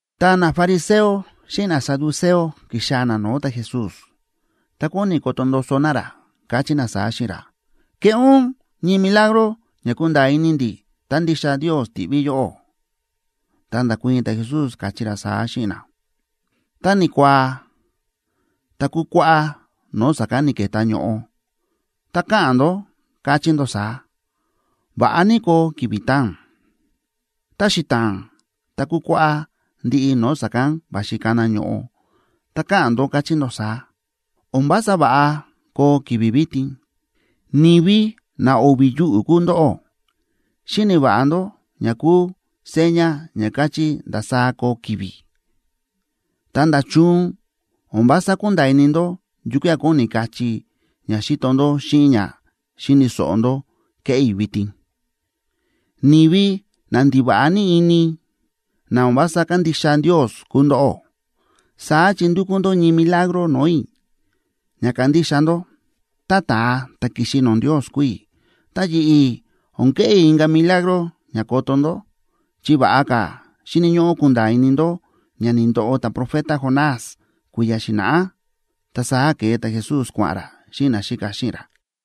Ta nafariseo xíꞌin nasaduceo ki̱xaa̱ na no̱o̱ ta̱Jesús. Ta kóni koto ndoso na ra, káchí na saá xíꞌin ra: ―Keꞌé ún ñii milagro ña kunda̱a̱ ini ndi̱, tá ndixa Ndios ti̱ꞌví yóꞌó. Ta nda̱kuii̱n ta̱Jesús, káchí ra saá xíꞌin na: ―Tá ni̱kuaa, tá kukuáꞌá no̱o̱ sa̱kán ni̱ke̱tá ño̱ꞌo, ta káꞌa̱n ndó, káchí ndó saá: “Va̱ꞌa ní koo ki̱vi̱ taa̱n.” Tá xita̱a̱n, tá kukuáꞌá ndiꞌi no̱o̱ sa̱kán va̱xi kana ño̱ꞌo, ta káꞌa̱n ndó, káchí ndó saá: “O̱n vása va̱ꞌa koo ki̱vi̱ vitin.” ¡Ni̱vi na o̱vi̱ yuꞌu̱ kúu ndóꞌó! Xíni̱ va̱ꞌa ndó ña kúu seña ña káchí ndasaá koo ki̱vi̱, ta, ¿nda̱chun o̱n vása kúnda̱a̱ ini ndó yukía̱ kóni kachí ña xíto ndó xíꞌin ña xíni̱ so̱ꞌo ndó kéꞌé i̱ vitin? ¡Ni̱vi na ndiva̱ꞌa ní ini, na o̱n vása kándixa Ndios kúu ndóꞌó! Saá chi ndúkú ndó ñii milagro no̱o̱ i̱ ña kandixa ndó tá ta̱a ta̱ ki̱xi no̱o̱ Ndios kúu i̱. Ta yi̱ꞌi̱ o̱n keꞌé i̱ inka̱ milagro ña koto ndó, chi va̱ꞌa ka̱ xíni̱ ñóꞌó kunda̱a̱ ini ndó ña ni̱ndoꞌo ta̱profeta Jonás kui̱ya̱ xi̱na̱ꞌá. Ta saá ke̱e ta̱Jesús kua̱ꞌa̱n ra xíꞌin naxíka xíꞌin ra.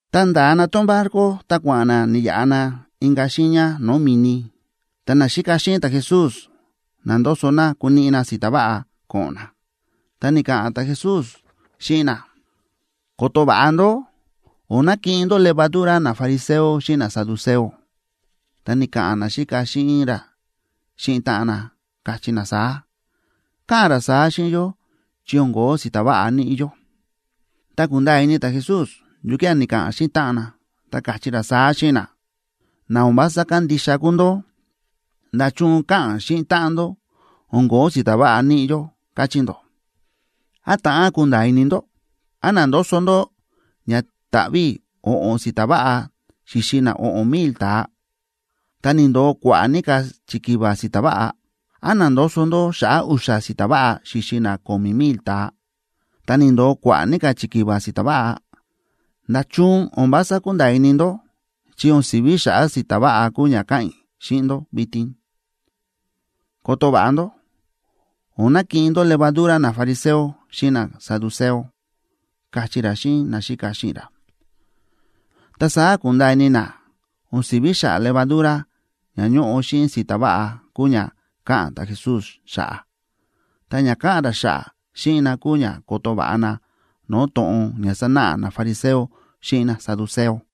Ta nda̱a na tón barco ta kua̱ꞌa̱n na ni̱yaꞌa na inka̱ xiiña no̱o̱ mi̱ni, ta naxíka xíꞌin ta̱Jesús na̱ndoso na kuniꞌi na si̱ta̱ váꞌa ko̱ꞌo̱n na. Ta ni̱ka̱ꞌa̱n ta̱Jesús xíꞌin na: ―Koto va̱ꞌa ndó. O̱n nakiꞌin ndó levadura nafariseo xíꞌin nasaduceo. Ta ni̱ka̱ꞌa̱n naxíka xíꞌin ra xíꞌin táꞌan na, káchí na saá: ―Káꞌa̱n ra saá xíꞌin yó chi o̱n ko̱ó si̱ta̱ váꞌa níꞌi yó. Ta ku̱nda̱a̱ ini ta̱Jesús yukía̱ ni̱ka̱ꞌa̱n xíꞌin táꞌan na, ta káchí ra saá xíꞌin na: ―Na o̱n vása kándixa kúu ndó. ¿Nda̱chun káꞌa̱n xíꞌin táꞌan ndó: “O̱n ko̱ó si̱ta̱ váꞌa níꞌi yó”, káchí ndó? ¿Án ta̱ꞌán kunda̱a̱ ini ndó? ¿Án na̱ndoso ndó ña ta̱ꞌví i̱ o̱ꞌo̱n si̱ta̱ váꞌa xíxi na o̱ꞌo̱n mil ta̱a, ta ni̱ndo̱o kua̱ꞌa̱ ní ka̱ chikiva si̱ta̱ váꞌa? ¿Án na̱ndoso ndó xa̱ꞌa̱ u̱xa̱ si̱ta̱ váꞌa xíxi na ko̱mi̱ mil ta̱a, ta ni̱ndo̱o kua̱ꞌa̱ ní ka̱ chikiva si̱ta̱ váꞌa? ¿Nda̱chun o̱n vása kúnda̱a̱ ini ndó chi o̱n si̱ví xa̱ꞌa̱ si̱ta̱ váꞌa kúu ña káꞌa̱n i̱ xíꞌin ndó vitin? Koto va̱ꞌa ndó, o̱n nakiꞌin ndó levadura nafariseo xíꞌin nasaduceo ―káchí ra xíꞌin naxíka xíꞌin ra. Ta saá ku̱nda̱a̱ ini na o̱n si̱ví xa̱ꞌa̱ levadura ña ñóꞌo xíꞌin si̱ta̱ váꞌa kúu ña káꞌa̱n ta̱Jesús xa̱ꞌa̱. Ta ña káꞌa̱n ra xa̱ꞌa̱ xíꞌin na kúu ña koto va̱ꞌa na no̱o̱ to̱ꞌon ña sánáꞌa nafariseo xíꞌin nasaduceo.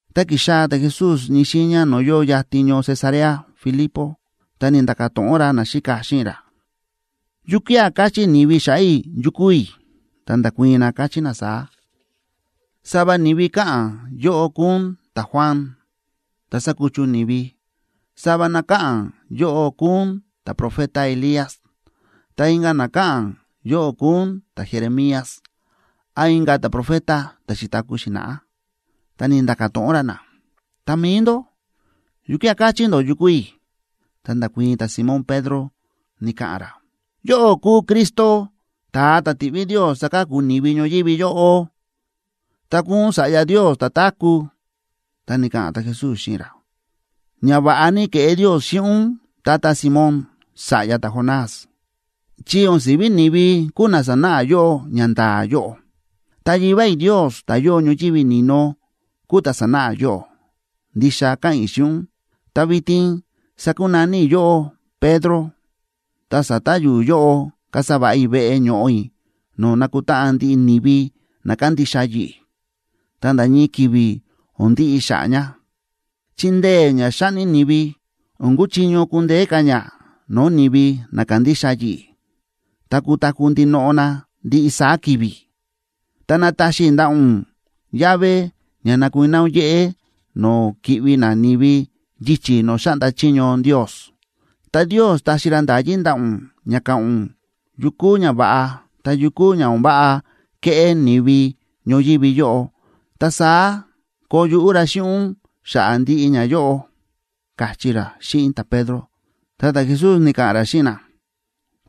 Ta ki̱xaa̱ ta̱Jesús ñii xiiña no̱o̱ yóo yatin ñoo Cesarea Filipo, ta ni̱nda̱ka̱ to̱ꞌon ra naxíka xíꞌin ra: ―¿Yukía̱ káchí ni̱vi xa̱ꞌa̱ i̱ yu kúu i̱? Ta nda̱kuii̱n na, káchí na saá: ―Sava ni̱vi káꞌa̱n yóꞌó kúu ún ta̱Juan, ta̱ sa̱kuchu ni̱vi. Sava na káꞌa̱n yóꞌó kúu ún ta̱profeta Elías. Ta inka̱ na káꞌa̱n yóꞌó kúu ún ta̱Jeremías án inka̱ ta̱profeta ta̱ xi̱taku̱ xi̱na̱ꞌá. Ta ni̱nda̱ka̱ to̱ꞌon ra na: ―Ta mi̱i ndó, ¿yukía̱ káchí ndó yu kúu i̱? Ta nda̱kuii̱n ta̱Simón Pedro, ni̱ka̱ꞌa̱n ra: ―Yóꞌó kúu Cristo, ta̱a ta̱ ti̱ꞌví Ndios saka̱ku ni̱vi ñoyívi yóꞌo, ta kúu ún Sa̱ꞌya Ndios ta̱táku̱. Ta ni̱ka̱ꞌa̱n ta̱Jesús xíꞌin ra: ―Ñava̱ꞌa ní ke̱ꞌé Ndios xíꞌin ún, tata Simón, sa̱ꞌya ta̱Jonás, chi o̱n si̱ví ni̱vi kúu na sa̱náꞌa yóꞌó ñanda̱a̱ yóꞌo. Ta Yivá i̱ Ndios, ta̱ yóo ñoyívi ni̱no, kúu ta̱ sa̱náꞌa yóꞌó. Ndixa káꞌa̱n i̱ xíꞌin ún, ta vitin sakunaní i̱ yóꞌó Pedro,a ta sa̱ta̱ yu̱u̱ yóꞌob kasa va̱ꞌa i̱ veꞌe ño̱ꞌo i̱ no̱o̱ nakutáꞌan ndiꞌi ni̱vi na kandixa yi̱ꞌi̱, ta nda̱ ñii ki̱vi̱ o̱n ndiꞌi xa̱ꞌa̱ ña, chi ndee̱ ña xáꞌni ni̱vi, o̱n kuchiño kundeé ka̱ ña no̱o̱ ni̱vi na kándixa yi̱ꞌi̱, ta kutaku̱ ndinoꞌo na ndiꞌi saá ki̱vi̱. Ta nataxi i̱ ndaꞌa̱ ún llave ña nakuiná ún yéꞌé no̱o̱ ki̱ꞌvi nani̱vi yichi̱ no̱o̱ xáꞌnda chiño Ndios. Ta Ndios taxi ra nda̱yí ndaꞌa̱ ún ña ka̱ꞌa̱n ún yu kúu ñava̱ꞌa ta yu kúu ña o̱n váꞌa keꞌé ni̱vi ñoyívi yóꞌo. Ta saá koo yuꞌú ra xíꞌin ún xa̱ꞌa̱ ndiꞌi ñayóꞌo ―káchí ra xíꞌin ta̱Pedro. Ta ta̱Jesús ni̱ka̱ꞌa̱n ra xíꞌin na: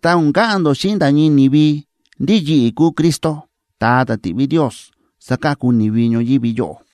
―Ta o̱n ka̱ꞌa̱n ndó xíꞌin nda̱ ñii ni̱vi ndí yi̱ꞌi̱ kúu Cristo, ta̱a ta̱ ti̱ꞌví Ndios saka̱ku ni̱vi ñoyívi yóꞌo.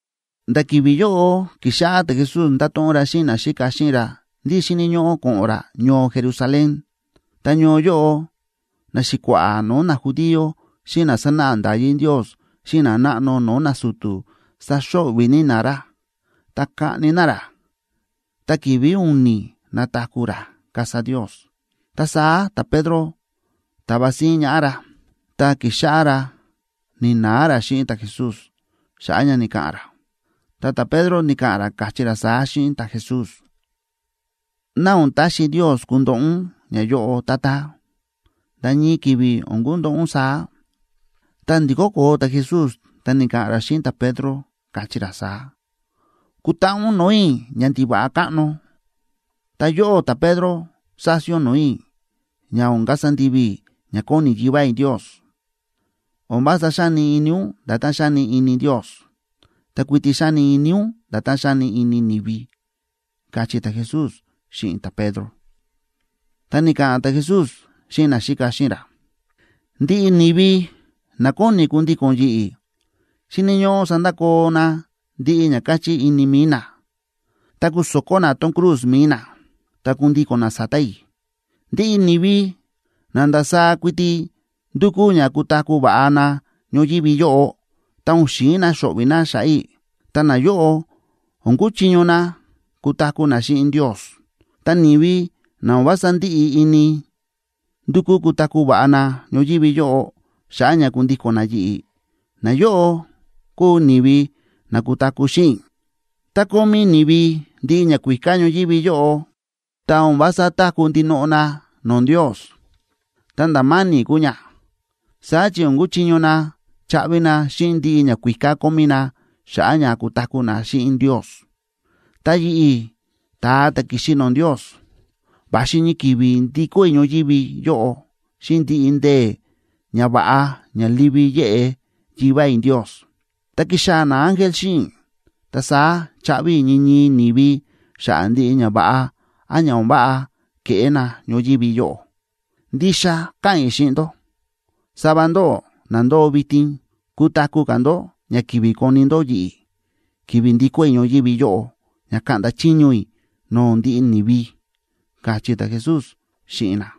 Nda̱ ki̱vi̱ yóꞌo ki̱xáꞌá ta̱Jesús ndáto̱ꞌon ra xíꞌin naxíka xíꞌin ra ndí xíni̱ ñóꞌó ko̱ꞌo̱n ra ñoo Jerusalén. Ta ñoo yóꞌo naxi̱kua̱ꞌa̱ no̱o̱ najudío, xíꞌin na sánáꞌa nda̱yí Ndios xíꞌin nanáꞌno no̱o̱ nasu̱tu̱ saxo̱ꞌvi̱ ní na ra. Ta kaꞌni na ra, ta ki̱vi̱ u̱ni̱ nataku̱ ra, kasa Ndios. Ta saá ta̱Pedro ta̱va síín ñaꞌá ra, ta ki̱xáꞌá ra ni̱na̱a ra xíꞌin ta̱Jesús xa̱ꞌa̱ ña ni̱ka̱ꞌa̱n ra, ta ta̱Pedro ni̱ka̱ꞌa̱n ra, káchí ra saá xíꞌin ta̱Jesús: ―¡Ná o̱n taxi Ndios kundoꞌo ún ñayóꞌo, Tata! ¡Nda̱ ñii ki̱vi̱ o̱n kundoꞌo ún saá! Ta ndi̱kó koo ta̱Jesús ta ni̱ka̱ꞌa̱n ra xíꞌin ta̱Pedro, káchí ra saá: ―¡Kutaꞌa ún no̱o̱ i̱, ñandiva̱ꞌa káꞌno! Ta yóꞌó ta̱Pedro sási ún no̱o̱ i̱ ña o̱n kasa ndivi i̱ ña kóni Yivá i̱ Ndios. O̱n vása xáni ini ún nda̱tán xáni ini Ndios. Ta kuiti xáni ini ún nda̱tán xáni ini ni̱vi ―káchí ta̱Jesús xíꞌin ta̱Pedro. Ta ni̱ka̱ꞌa̱n ta̱Jesús xíꞌin naxíka xíꞌin ra: ―Ndiꞌi ni̱vi na kóni kundíko̱n yi̱ꞌi̱ xíni̱ ñóꞌó sandakoo na ndiꞌi ña káchí ini mi̱i na, ta kuso̱kó na tón cruz mi̱i nac ta kundíko̱n na sa̱ta̱ i̱. Ndiꞌi ni̱vi na ndasaá kuiti ndúkú ña kutaku̱ va̱ꞌa na ñoyívi yóꞌo, ta o̱n xi̱in na xo̱ꞌvi̱ na xa̱ꞌa̱ i̱, ta nayóꞌo o̱n kuchiño na kutaku̱ na xíꞌin Ndios. Ta ni̱vi na o̱n vása ndíꞌi ini ndukú kutaku̱ va̱ꞌa na ñoyívi yóꞌo, xa̱ꞌa̱ ña kundíko̱n na yi̱ꞌi̱, nayóꞌo kúu ni̱vi na kutaku̱ xíꞌin i̱. Tá kómí ni̱vi ndiꞌi ñakuíká ñoyívi yóꞌo, ta o̱n vása táku̱ ndinoꞌo na no̱o̱ Ndios, ta nda̱ ma̱ni̱ kúu ña. Saá chi o̱n kuchiño na chaꞌvi na xíꞌin ndiꞌi ñakuíká kómí na xa̱ꞌa̱ ña kutaku̱ na xíꞌin Ndios. Ta yi̱ꞌi̱, ta̱a ta̱ ki̱xi no̱o̱ Ndios, va̱xi ñii ki̱vi̱ ndikó i̱ ñoyívi yóꞌo xíꞌin ndiꞌi ndee̱ ñava̱ꞌa ña livi yéꞌe Yivá i̱ Ndios, ta kixaa̱ naángel xíꞌin i̱, ta saá chaꞌvi i̱ ñii ñii ni̱vi xa̱ꞌa̱ ndiꞌi ñava̱ꞌa án ña o̱n váꞌa ke̱ꞌé na ñoyívi yóꞌo. Ndixa káꞌa̱n i̱ xíꞌin ndó, sava ndóꞌó na ndóo vitin, kutaku̱ ka̱ ndó ña kivi koni ndó yi̱ꞌi̱, ki̱vi̱ ndikó i̱ ñoyívi yóꞌo ña kaꞌnda chiño i̱ no̱o̱ ndiꞌi ni̱vi ―káchí ta̱Jesús xíꞌin na.